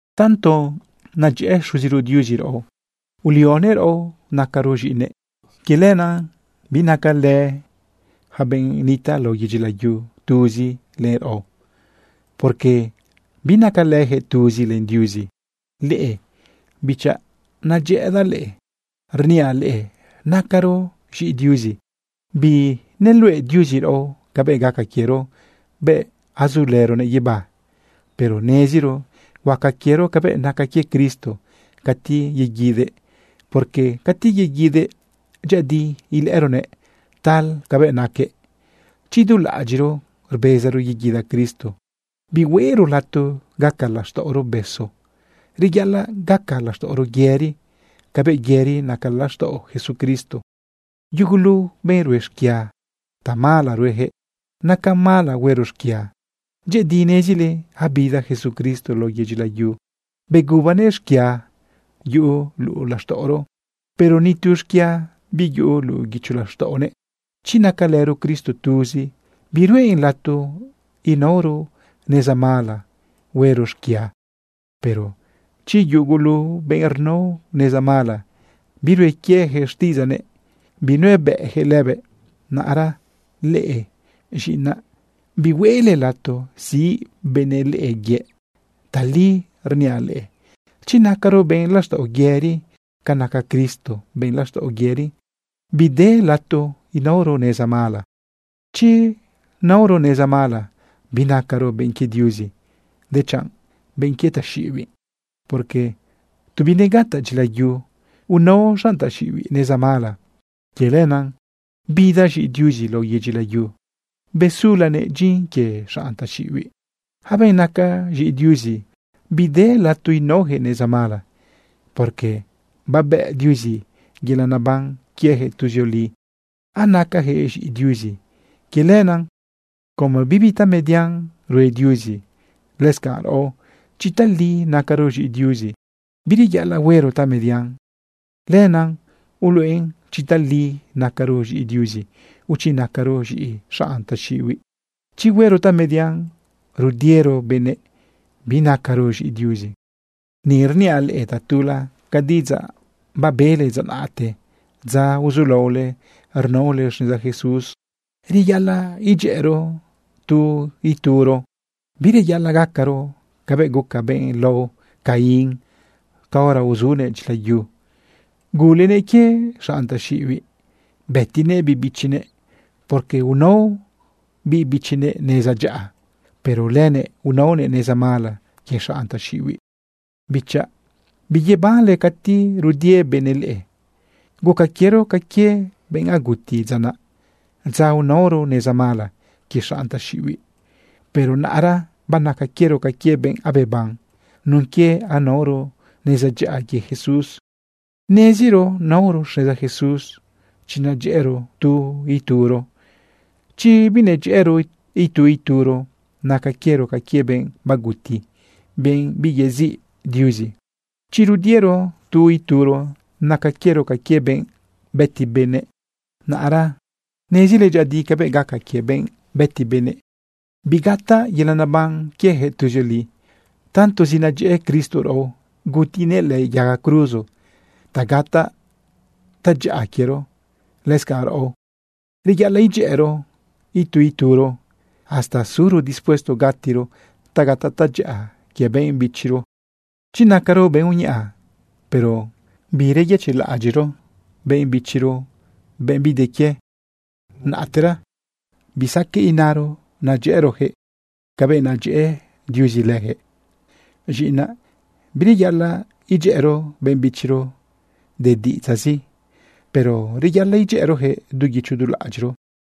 Tanto nedyëꞌë Xuziro Diuzi raꞌo ulionëꞌ raꞌo nacaro z̃iꞌinëꞌ. Quie lenaꞌ binacalë yaca benꞌ nitaꞌ lao yedyi layu tuzi len raꞌo, porque binacalëjëꞌ tuzi len Diuzi. Leꞌe bichaꞌ, nadyëꞌëdaꞌ leꞌe. Rniaꞌ leꞌe nacaro z̃iꞌi Diuzi. Bineluꞌe Diuzi raꞌo cabëꞌ gaca quiero bëꞌ azulëronëꞌ guibá, pero neziro huaca quiero cabëꞌ naca quie Cristo cati yeguidëꞌ. Porque cati yeguidëꞌ, dyëꞌëdi ilëꞌëronëꞌ tal cabëꞌ naquëꞌ. Chi du laꞌadyiꞌro rbezaro yeguida Cristo, bihueꞌro lato gaca laxtaꞌoro besu. Reyaꞌalaꞌ gaca laxtaꞌoro yëri cabëꞌ yëri naca laxtaꞌo Jesucristo. Yugulu benꞌ rue xquia, tamala ruejëꞌ. Nacan mala huero xquia. Dyëꞌëdi nezile abida Jesucristo lao yedyi layu begubanëꞌ xquia yuꞌu luꞌu laxtaꞌoro, pero ni tu xquia biyuꞌu luꞌu guicho laxtaꞌonëꞌ. Chi nacalëro Cristo tuzi, biruꞌen lato inaoro neza mala huero xquia. Pero yugulu benꞌ rnao neza mala, birue quieyaquëꞌ xtiꞌidzaꞌnëꞌ, binuebëꞌyaquëꞌ lëbëꞌ. Naꞌra leꞌe, z̃iꞌinaꞌ, bihueꞌle lato siꞌ benëꞌ leꞌe yëꞌ. Tali rniaꞌ leꞌe: Chi nacaro benꞌ laxtaꞌo yëri ca naca Cristo benꞌ laxtaꞌo yëri, bide lato inaoro neza mala. Chi naoro neza mala, binacaro benꞌ quie Diuzi, dechanꞌ benꞌ quie taxiꞌibiꞌ, porque tu binegataꞌ dyilayu unao xanꞌ taxiꞌibiꞌ neza mala. Quie lenaꞌ bida z̃iꞌi Diuzi lao yedyi layu besulanëꞌ dyin quie xanꞌ taxiꞌibiꞌ. Yaca benꞌ naca z̃iꞌi Diuzi, bide lato inaoyaquëꞌ neza mala, porque babëꞌ Diuzi yelaꞌ naban quiejëꞌ tuzioli, anacajëꞌ z̃iꞌi Diuzi. Quie lenaꞌ, como bibi tamedian rue Diuzi, lëscanꞌ raꞌo, chi tali nacaro z̃iꞌi Diuzi, bireyaꞌalaꞌ huero tamedian. Lenaꞌ uluꞌen chi tali nacaro z̃iꞌi Diuzi, o chi nacaro z̃iꞌi xanꞌ taxiꞌibiꞌ. Chi huero tamedian rudiero benëꞌ, binacaro z̃iꞌi Diuzi. Ni rniaꞌ leꞌe tatula ca diꞌidzaꞌ babele dza naꞌte, dza uzulaole rnaole xneza Jesús: Reyaꞌalaꞌ idyëꞌëro tu ituro. Bireyaꞌalaꞌ gacaro cabëꞌ guca benꞌ lao Caín caora uzunëꞌ dyila yu. Gulenëꞌ quie xanꞌ taxiꞌibiꞌ bëtinëꞌ biꞌ bichinëꞌ, porque unao biꞌ bichinëꞌ neza dyaꞌa, pero lënëꞌ unaonëꞌ neza mala quie xanꞌ taxiꞌibiꞌ. Bichaꞌ, biyebanle cati rudie benëꞌ leꞌe. Guca quiero ca quie benꞌ aguti dza naꞌ, dza unaoro neza mala quie xanꞌ taxiꞌibiꞌ. Pero naꞌra banaca quiero ca quie benꞌ abeban nun quie anaoro neza dyaꞌa quie Jesús. Neziro naoro xneza Jesús chi nadyëꞌëro tu ituro. Chi binadyëꞌëro itu ituro, naca quiero ca quie benꞌ baguti, benꞌ biyeziꞌ Diuzi. Chi rudiero tu ituro, naca quiero ca quie benꞌ bëti benëꞌ. Naꞌra nezile dyëꞌëdi cabëꞌ gaca quie benꞌ bëti benëꞌ. Bigataꞌ yelaꞌ neban quieyaquëꞌ tuzioli. Tantozi nadyëꞌë Cristo raꞌo, gutinëꞌ lëꞌë yaga cruzo ta gataꞌ tadyaꞌa quiero. Lëscanꞌ, raꞌo, reyaꞌalaꞌ idyëꞌërëro itu ituro, hasta suro dispuesto gatiro ta gataꞌ tadyaꞌa quie benꞌ bichiro. Chi nacaro benꞌ uñaꞌa, pero biyëchiꞌlaꞌadyiꞌro benꞌ bichiro, benꞌ bide quie, naꞌtera bisaqueꞌ inaro nadyëꞌërojëꞌ cabëꞌ nadyëꞌë Diuzi lëjëꞌ. Z̃iꞌinaꞌ, bireyaꞌalaꞌ idyëꞌëro benꞌ bichiro de diꞌidzaꞌzi, pero reyaꞌalaꞌ idyëꞌërojëꞌ du guicho du laꞌadyiꞌro.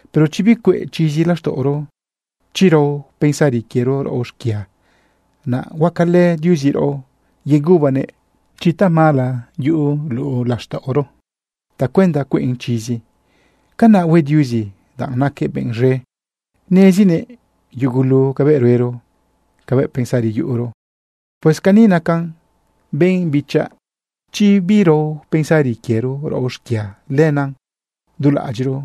Pero chi bicueꞌ chizi laxtaꞌoro, chi rao pensari quiero raꞌo xquia, naꞌ huacalë Diuzi raꞌo yegubanëꞌ chi tamala yuꞌu luꞌu laxtaꞌoro tacuenda cueꞌn chizi. Canaꞌ hue Diuzi, danꞌ naquëꞌ benꞌ z̃e, nezinëꞌ yugulu cabëꞌ ruero, cabëꞌ pensari yuꞌuro. Pues cani nacan, benꞌ bichaꞌ: Chi birao pensari quiero raꞌo xquia, lenaꞌ du laꞌadyiꞌro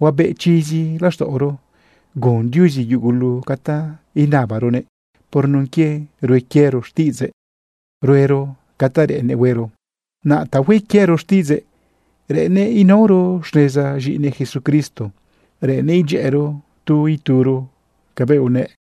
huabeꞌ chizi laxtaꞌoro. Gun Diuzi yugulu ca ta inabaronëꞌ por nun quie rue quiero xtiꞌidzëꞌ, ruero ca ta reꞌennëꞌ huero. Naꞌ ta hue quiero xtiꞌidzëꞌ, reꞌennëꞌ inaoro xneza z̃iꞌinëꞌ Jesucristo, reꞌennëꞌ idyëꞌëro tu ituro cabëꞌ unëꞌ.